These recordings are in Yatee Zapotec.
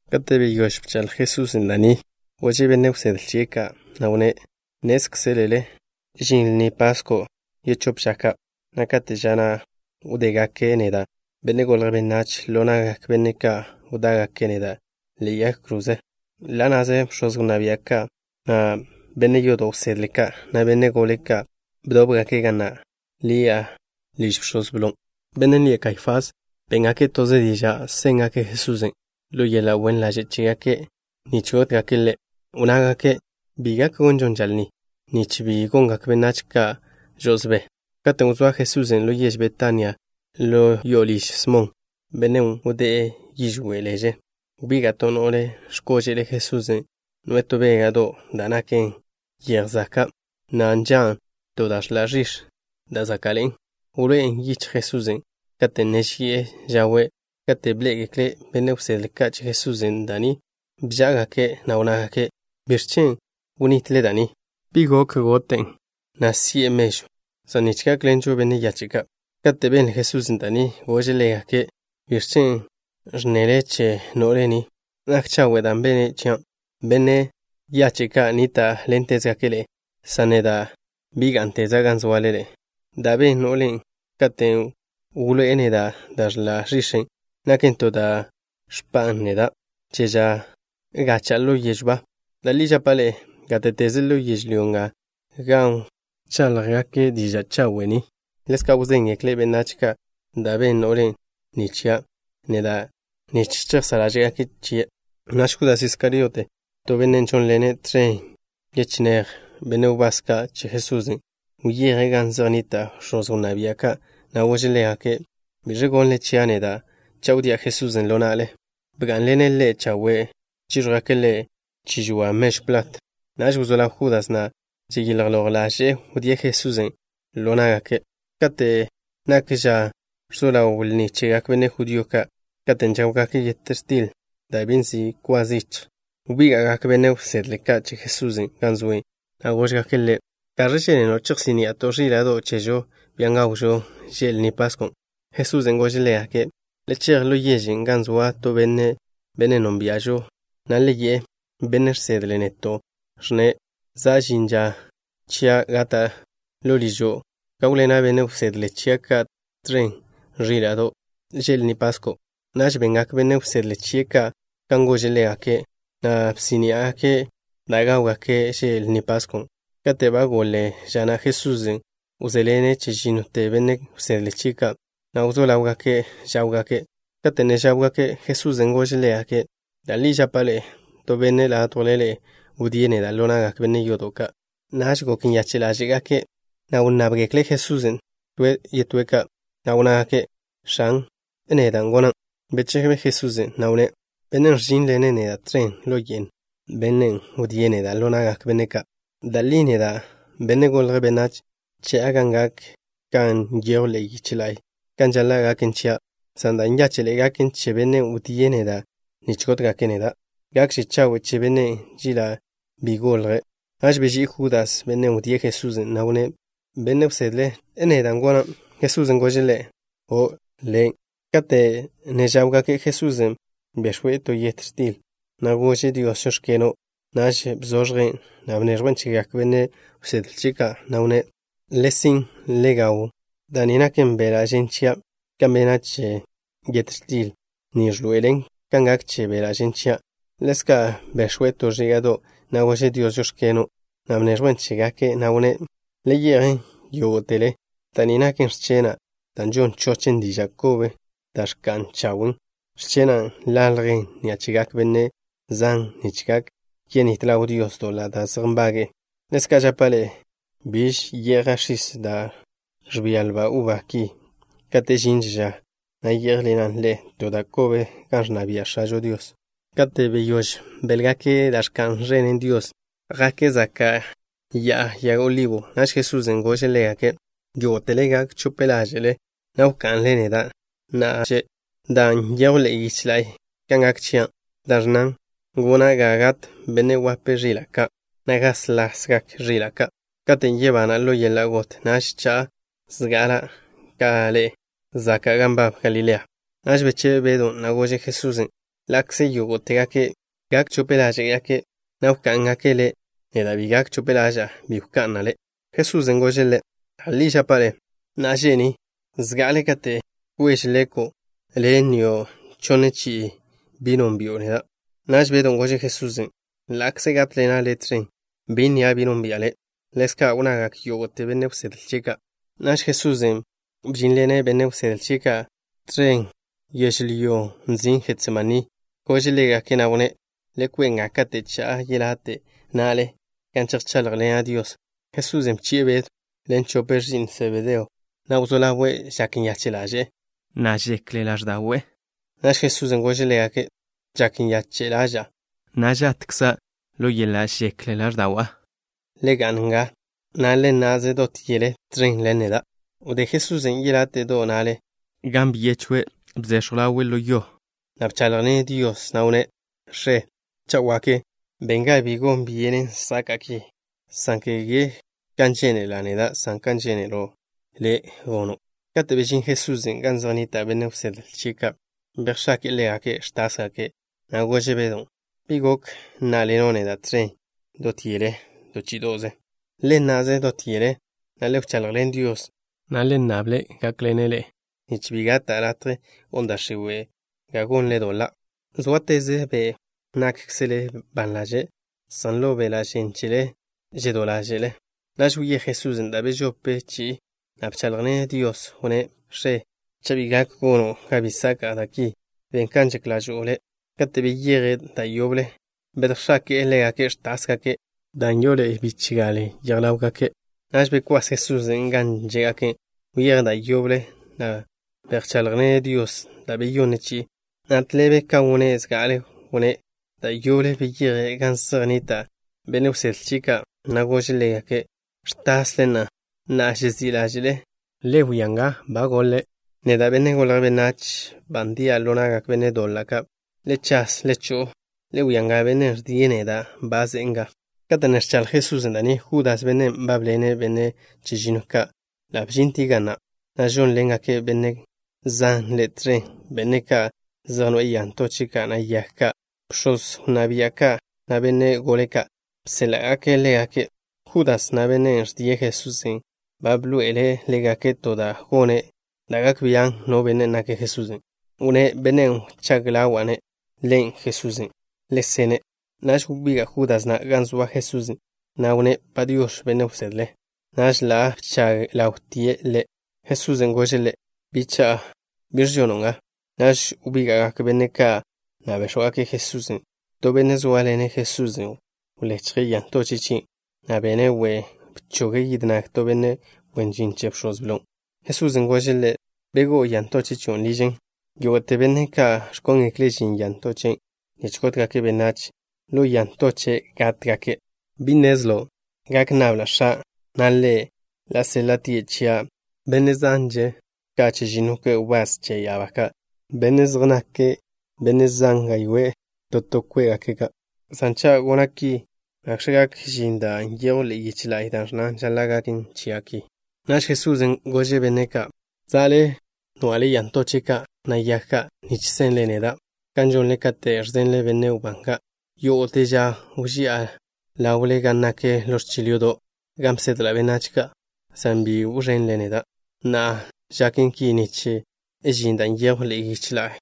Kate' beyóž bchaḻj Jesusen' da' ni, gože' benne' wsedle chie' ka', na' wnné': —Nnézkzelele žin Lni Pasko' yechóp ža ka', na' kate' ža na' wdégake' neda', Benne' Golje' Benách, ḻo na'gak benne' ka' wdá'gake' neda' ḻe'e yag kroze. Ḻa' na'ze bx̱oz wnná bia' ka' na' benne' yodo' wsedle ka', na' benne' gole ka', bdóbgake' gan nak ḻi'a liž bx̱oz blo, bennen' lie' Kaifás. Béngake' toze diža' séngake' Jesusen' ḻo yeḻa' wen ḻaže' chégake', nich gótgake' Ḻe'. Wnnágake': —Bi gak gonžon ža lni, nich bi gongak benách ka' žo'osbé. Katen' wzóa Jesusen' ḻo yež Betania ḻo liž Smon, bennen' wdé'e yižwé' leže, wbiga' to no'le x̱kóže'le Jesusen', noe'e to béga'do' da' naken yej zaka', na' nžan' to da' ẕḻa' ẕix̱ da' záka'ḻe'en. Wloé'en yichj Jesusen' kate' ne ži'e žawe'. Kate' bḻé'egekle benne' wsedle ka' che Jesusen' da' ni, bžá'agake', na' wnnágake': —¿Biẕ chen' wnitle da' ni? Gok no benne' gote'en, na' si'e mežw zan nich gákḻenžo benne' yache' ka'. Kate' benle Jesusen' da' ni, gože' ḻégake': —¿Biẕ chen' ẕnnele che no'le ni? Nak chawe' da' bene' chia'. Benne' yache' ka' nníta'ḻentezgake' ḻe'e, san neda' bi gá'nteza' gan zoale ḻe'e. Da' ben no'le ni katen' wloé'e neda' da' ẕḻa' ẕix̱en', naken to da' ẕpa'an neda' che ža gacha'a ḻo yežw ba. Da' li žapa' ḻe'e, gáte'teze ḻo yežlyó nga gan wcháḻjgake' diža' chawe' ni, ḻezka' wzéngekle' benách ka' da' ben no'le ni chia' neda' nich chejsá' ḻáže'gake' chie'. Naž Judas Iskariote, to benne' žónḻene' tẕen yechinéj benne' wbás ka' che Jesusen', wyeje' gan zej nnita' bx̱oz wnná bia' ka', na' gože' ḻégake': —¿Biẕ gonnle chia' neda' cha' wdía' Jesusen' ḻo na'le? Bgá'nḻene' ḻe' chawe' chíẕjwgake' ḻe' chi žoa mežw plat. Naž wzó ḻaw Judas na' žilj loj ḻaže'e wdíe' Jesusen' ḻo ná'gake'. Kate' nak ža ẕzo ḻaw lni chegak benne' judío ka' katen' žáwgake' yet x̱til da' bi nzi' kwa zichj, wbíga'gak benne' wsedle ka' che Jesusen' gan zoe', na' góžgake' Ḻe': —¿Gaẕ žénelo' chejsí'ni'ato' ẕíla'do' chežo, bian' gawžo že' Lni Pasko'? Jesusen' gože' ḻégake': —Le chej ḻo yežen' gan zoa to benne', bennen' nónbia'žo, na' le yi'e: “Benne' žsedle' neto' ẕnne': Za' žin ža chia' gata'. Ḻo ližo' gáwḻena' benne' wsedle chia' ka' tẕen ẕíla'do' že' Lni Pasko'.” Naž bengak benne' wsedle chie' ka' kan gože' ḻégake', na' bsí'ni'gake' da' gáwgake' že' Lni Pasko'. Kate' ba goḻe ža na', Jesusen' wžé'ḻene' chežínnote benne' wsedle chie' ka', na' wzó ḻáwgake' žáwgake'. Kate' ne žáwgake', Jesusen' gože' ḻégake': —Da' li žapa' ḻe'e, to benne' ládjwle ḻe'e wdíe' neda' ḻo na'gak benne' yodo' ka'. Naž gok nyache' ḻáže'gake', na' wnnábgekle' Jesusen' to toze', na' wnnágake': —X̱an, ¿neda' gonan'? Bechebe Jesusen', na' wnné': —Bennen' ẕžínḻene' neda' tẕen ḻo ye'n, bennen' wdíe' neda' ḻo na'gak benne' ka'. Da' li neda', Benne' Golje' Benách, cha'a gan gak kan nyejw ḻe'e yiche la'y kan žaḻa' gaken chia', san da' nyáche'ḻe'e gaken che bennen' wdíe' neda' nich gótgake' neda'. Gakže chawe' che bennen' chela' bi golje'. Naž beží'i Judas, bennen' wdíe' Jesusen', na' wnné': —Benne' wsedle, ¿neda' gonan'? Jesusen' gože' ḻe': —O', le' na'. Kate' ne žáwgake', Jesusen' bex̱we' to yet x̱til, na' gože' Dios: “Žóx̱keno'.” Naž bzoẕjen', na' bneẕjwen' chegak benne' wsedle chie' ka', na' wnné': —Le sin', le gawn. Da' ni naken beḻa' žen chia'. Kan bena' che yet x̱til ni ẕḻoe'elen kan gak che beḻa' žen chian'. Ḻezka' bex̱we' to ẕíga'do', na' gože' Dios: “Žóx̱keno'.” Naž bneẕjwen' chégake', na' wnné': —Le ye'jen yógo'tele. Da' ni naken x̱chena' da' žon chochen diža' kobe da' ẕka'n chawen'. X̱chenan' ḻaljen ni'a chegak benne' zan nich gak yenít ḻaw Dios doḻa' da' zej nbage'e. Ḻezka' žapa' ḻe'e, biž ye'ja' x̱is da' ẕbia lba uba ki kate' žinže ža na' yé'jḻena' ḻe'e to da' kobe gan ẕnna bia' X̱ažo Dios. Kate' beyóž béḻgake' da' ẕka'n ẕenen Dios, jake' zaka' Ya'a Yag Olibo. Naž Jesusen' gože' ḻégake': —Yógo'tele gak chope ḻáže'le, na' wka'nle neda' na'a že' ni, dan' nyejw ḻe'e yiche la'y kan gak chia', da' ẕnnan: “Gona' ga gat Benne' Wape Ẕila' Ka', na' gáslasgak ẕila' ka'.” Katen' yebana' ḻo yeḻa' got, naž cha'a zga'ala' ka ḻe'e zaka' gan nbab Galilea. Naž bechebe Bedw, na' gože' Jesusen': —Ḻa'kze yógo'tegake' gak chope ḻáže'gake', na' wká'ngake' Le', neda' bi gak chope ḻaža'a, bi wka'na' Le'. Jesusen' gože' ḻe': —Da' li žapa' le', na'a že' ni, zga'ale kate' kweže leko', le' nnio' chonne chi'i bi nónbi'o neda'. Naž Bedon' gože' Jesusen': —Ḻa'kze gátḻena' Le' tẕen, bi nnia' bi nónbi'a Le'. Ḻezka' wnnagak yógo'te benne' wsedle chie' ka'. Naž Jesusen' bžínḻene' benne' wsedle chie' ka' tẕen yežlyón' nzin' Jetsemaní. Gože' ḻégake', na' wnné': —Le kwe' nga kate' cha'a yelate' na'le, gan chejcháḻjḻena' Dios. Jesusen' bchi'e Bedw ḻen chope ẕi'n Sebedeo, na' wzó ḻawe' žak nyache' ḻaže'e, na' žek ḻáẕda'we'. Naž Jesusen' gože' ḻégake': —Žak nyache' ḻaža'a, na' žatkza' ḻo yeḻa' žek ḻáẕda'wa'. Le ga'n nga, na' le nna'ze dot yele tẕen ḻen neda'. Wdé Jesusen' yeláte'do' na'le, gan byechwe'. Bzechw ḻawe' ḻo yo, na' bcháḻjḻene' Dios, na' wnné': —X̱e, cha' wak, ben ga bi gon byenen saka'a ki, san kege kan žénela' neda', san kan žénelo' Le' gono'. Kate' bežín Jesusen' gan zej nnita' benne' wsedle chie' ka', bejx̱ake'e ḻégake' ẕtásgake', na' gože' Bedon': —¿Bi gok nná'ḻeno' neda' tẕen yele to chí'ido'ze? Le nna'ze dot yele, na' le wchaḻjḻen Dios, na' le nnable-ne' gákḻene' ḻe'e, nich bi gata' latje gon da' x̱iwe' ga gonle doḻa'. Zóateze be' nákkzele ban ḻaže', san ḻo beḻa' žen chele žedó ḻáže'le. Naž wyéj Jesusen' da' bežope chi'i, na' bcháḻjḻene' Dios. Wnné': —X̱e, cha' bi gak gono' ga bi saka'a da' ki, ben kan žak ḻažo'o Le'. Kate' beyeje', da' yoble bedjx̱ake'e ḻégake' ẕtásgake' dan' ndeḻe'e yele yej ḻáwgake'. Naž bekwás Jesusen' gan žé'gake'. Wyeje' da' yoble, na' bcháḻjḻene' Dios da' beyonne chi'i, na' tḻebe kan wnné' zga'ale wnné'. Da' yoble beyeje' gan zej nnita' benne' wsedle chie' ka', na' gože' ḻégake': —¿Ẕtasle na'a, na' žezí' ḻáže'le? Le wia nga, ba golen. Neda', Benne' Golje' Benách, ba ndia' ḻo na'gak benne' doḻa' ka'. Le chas, le cho'o. Le wia nga, bennen' ẕdie' neda' ba ze'e nga. Kate' ne ẕchaḻj Jesusen' da' ni, Judas, bennen' nbábḻene' benne' chežinnoe' ka', ḻa' bžintie' ga na', na' žónḻengak benne' zan ḻe' tẕen, benne' ka' zej noe'e ya ntoche' ka', na' yag ka'. Bx̱oz wnná bia' ka' na' benne' gole ka', bséḻa'gake' ḻégake'. Judas na', bennen' ẕdie' Jesusen', ba bḻoe'ele' ḻégake' to da' gone' da' gak bian' no benne' nake' Jesusen'. Wnné': —Bennen' wchág ḻawa'-ne', Ḻen' Jesusen'. Le sene'. Naž wbiga' Judas na' gan zoa Jesusen', na' wnné': —Padiox̱, Benne' Wsedle. Naž ḻa' bchag ḻawtie' Ḻe'. Jesusen' gože' ḻe': —Bicha'a, ¿biẕ žono' nga? Naž wbíga'gak benne' ka', na' béx̱wgake' Jesusen'. To benne' zóaḻene' Jesusen' wlechje' ya ntoche' chie', na' bene' we', bchoge' yid nag to benne' wen žin che bx̱oz blo. Jesusen' gože' ḻe': —Begó'o ya ntoche' chion' ližen. Yógo'te benne' ka' ẕkóngekle' žin ya ntoche' nich gótgake' benách, ḻo ya ntoche' gátgake'. ¿Bi nnezlo' gak nnabla' X̱a', na' Ḻe' ḻa' séḻa'tie' chia' da' zánḻe'eže ka chežinno kwe' wbás che ya'abá ka', da' zej naken da' zan gaywé'e to to kwen'? San cha' gona' ki, ¿nakx̱ gak žin da' nyejw ḻe'e yiche la'y, da' ẕnnan žaḻa' gaken chia' ki? Naž Jesusen' gože' benne' ka': —Za'le nwa'le ya ntoche' ka', na' yag ka', nich senle neda' kan žonle katen' ẕzenle benne' wbán ka'. Yógo'te ža wži'a ḻawle gan nak ḻo ẕchil yodo', gan bsedla' benách ka', san bi wẕenle neda'. Na'a žaken ki nich žin da' nyejw ḻe'e yiche la'y,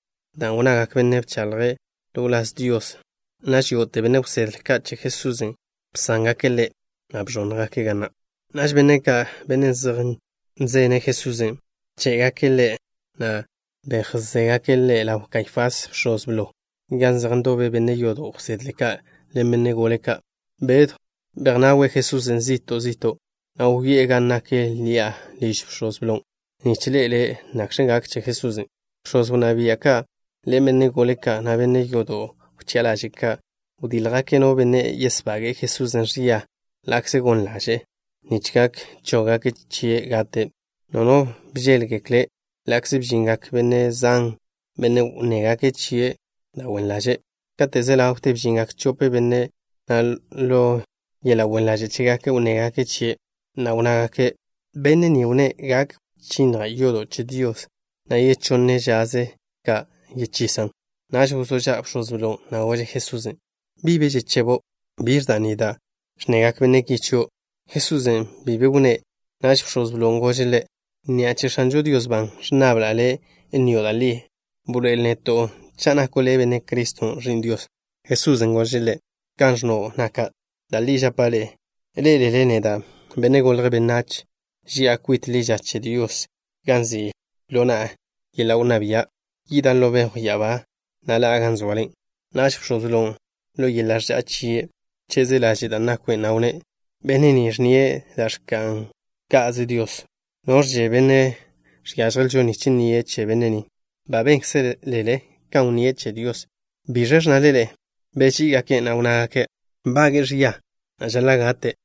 dan' wnnagak benne' ka' bcháḻjgake' ḻo wláz Dios. Naž yógo'te benne' wsedle ka' che Jesusen' bsángake' Ḻe', na' beẕónnjgake' ga na'. Naž benne' ka', benne' zej nzene' Jesusen', bché'gake' Ḻe', na' bejzégake' Ḻe' ḻaw Kaifás, bx̱oz blo, gan zej ndobe benne' yodo' wsedle ka' ḻen benne' gole ka'. Bedw bejnawe' Jesusen' zi'to' zi'to', na' wyoé'e gan nak ḻi'a liž bx̱oz blon', nich ḻe'ele' nakx̱ gak che Jesusen'. Bx̱oz wnná bia' ka' ḻen benne' gole ka', na' benne' yodo' wchi'a ḻaže' ka', wdíljgake' no benne' yesbage'e Jesusen' ẕia ḻa'kze gon ḻaže'e, nich gak chóggake' chie' gate'. No no bžéḻgekle' ḻa'kze bžingak benne' zan, benne' wnnégake' chie' da' wen ḻaže'. Kate' ze ḻawte bžingak chope benne', na' ḻo yeḻa' wen ḻaže' chégake' wnnégake' chie', na' wnnágake': —Benne' ni wnné': “Gak wchinnja' yodo' che Dios, na' yechonne žaze ka' yechisan'.” Naž wzó ža' bx̱oz blon', na' gože' Jesusen': —¿Bi be žechebo'? ¿Biẕ da' ni da' ẕnnegak benne' ki chio' Le'? Jesusen' bi be wnné'. Naž bx̱oz blon' gože' Ḻe': —Ni'a che X̱anžo Dios ban ẕnnabla' Le' nnio' da' li. Bḻoe'el neto' cha' nako' Le' Benne' Criston', Ẕi'n Dios. Jesusen' gože' ḻe': —Kan ẕnno' naka'. Da' li žapa' ḻe'e, ḻé'elele neda', Benne' Golje' Benách, ži'a kwit ḻi ža che Dios, gan nzi' ḻo na'a yeḻa' wnná bia'. Yida' ḻo bejw ya'abá, na' ḻa'a gan soale. Naž bx̱oz blon', ḻo yeḻa' ẕža'a chie' wcheze' laže' da' nakwe', na' wnné': —Benne' ni ẕnnie' da' ẕka'n ka'ze Dios. ¿Noẕže benne' žiážjelžo nich nnie' che benne' ni? Ba bénkzelele kan wnníe' che Dios. ¿Biẕe ẕnnale ḻe'e? Beží'igake', na' wnnágake': —Nbage'e ẕia, na' žaḻa' gate'.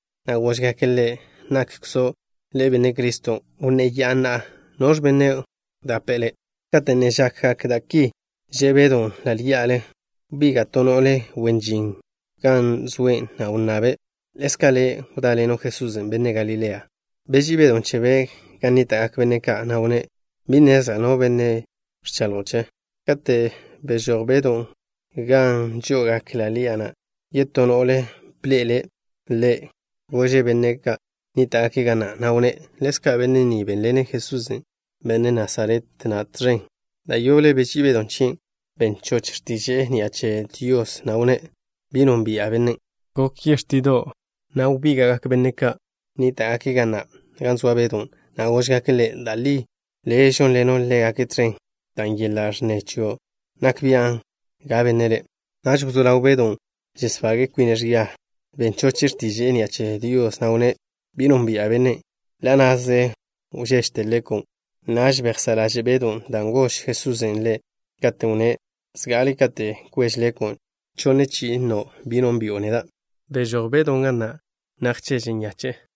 na' góžgake' Ḻe': —¿Nakkzo' Le' Benne' Criston'? Wnnéya'a na'a. ¿Noẕ bennen' wdape'e Le'? Kate' ne žakgak da' ki, že' Bedw ḻa' ḻí'ale. Wbiga' to no'le wen žin gan zoe', na' wnnabe': —Ḻezka' le' wdáḻeno' Jesusen', benne' Galilean'. Beží'i Bedon' chebe' gan nníta'gak benne' ka', na' wnné': —Bi nnezla' no bennen' ẕchaḻjo' chien'. Katen' bžoj Bedon' gan žó'ogake' ḻi'a na', yetó no'le bḻe'ele' ḻe'. Gože' benne' ka' nníta'gake' ga na', na' wnné': —Ḻezka' benne' ni bénḻene' Jesusen', benne' Nasaret na' tẕen. Da' yoble beží'i Bedon' chen. Ben choche' x̱tiže'e ni'a che Dios, na' wnné': —Bi nónbi'a Bennen'. Yeláte'do'ze wžé, wbíga'gak benne' ka' nníta'gake' ga na' gan zoa Bedon', na' góžgake' ḻe': —Da' li le' žónḻeno' ḻégake' tẕen dan' yeḻa' ẕnneze chio' nak bian' ga benne' le'. Naž wzó ḻaw Bedon' žesbaga' kwine' ẕia. Ben choche' x̱tiže'e ni'a che Dios, na' wnné': —Bi nónbi'a Bennen'. Ḻa' na'ze wžéžete leko'. Naž bejsá' ḻaže' Bedon' dan' gož Jesusen' ḻe', katen' wnné': “Zga'ale kate' kweže leko', chonne chi'i nnio' bi nónbi'o neda'.” Bžoj Bedon' ga na', na' wžeže nyache'e.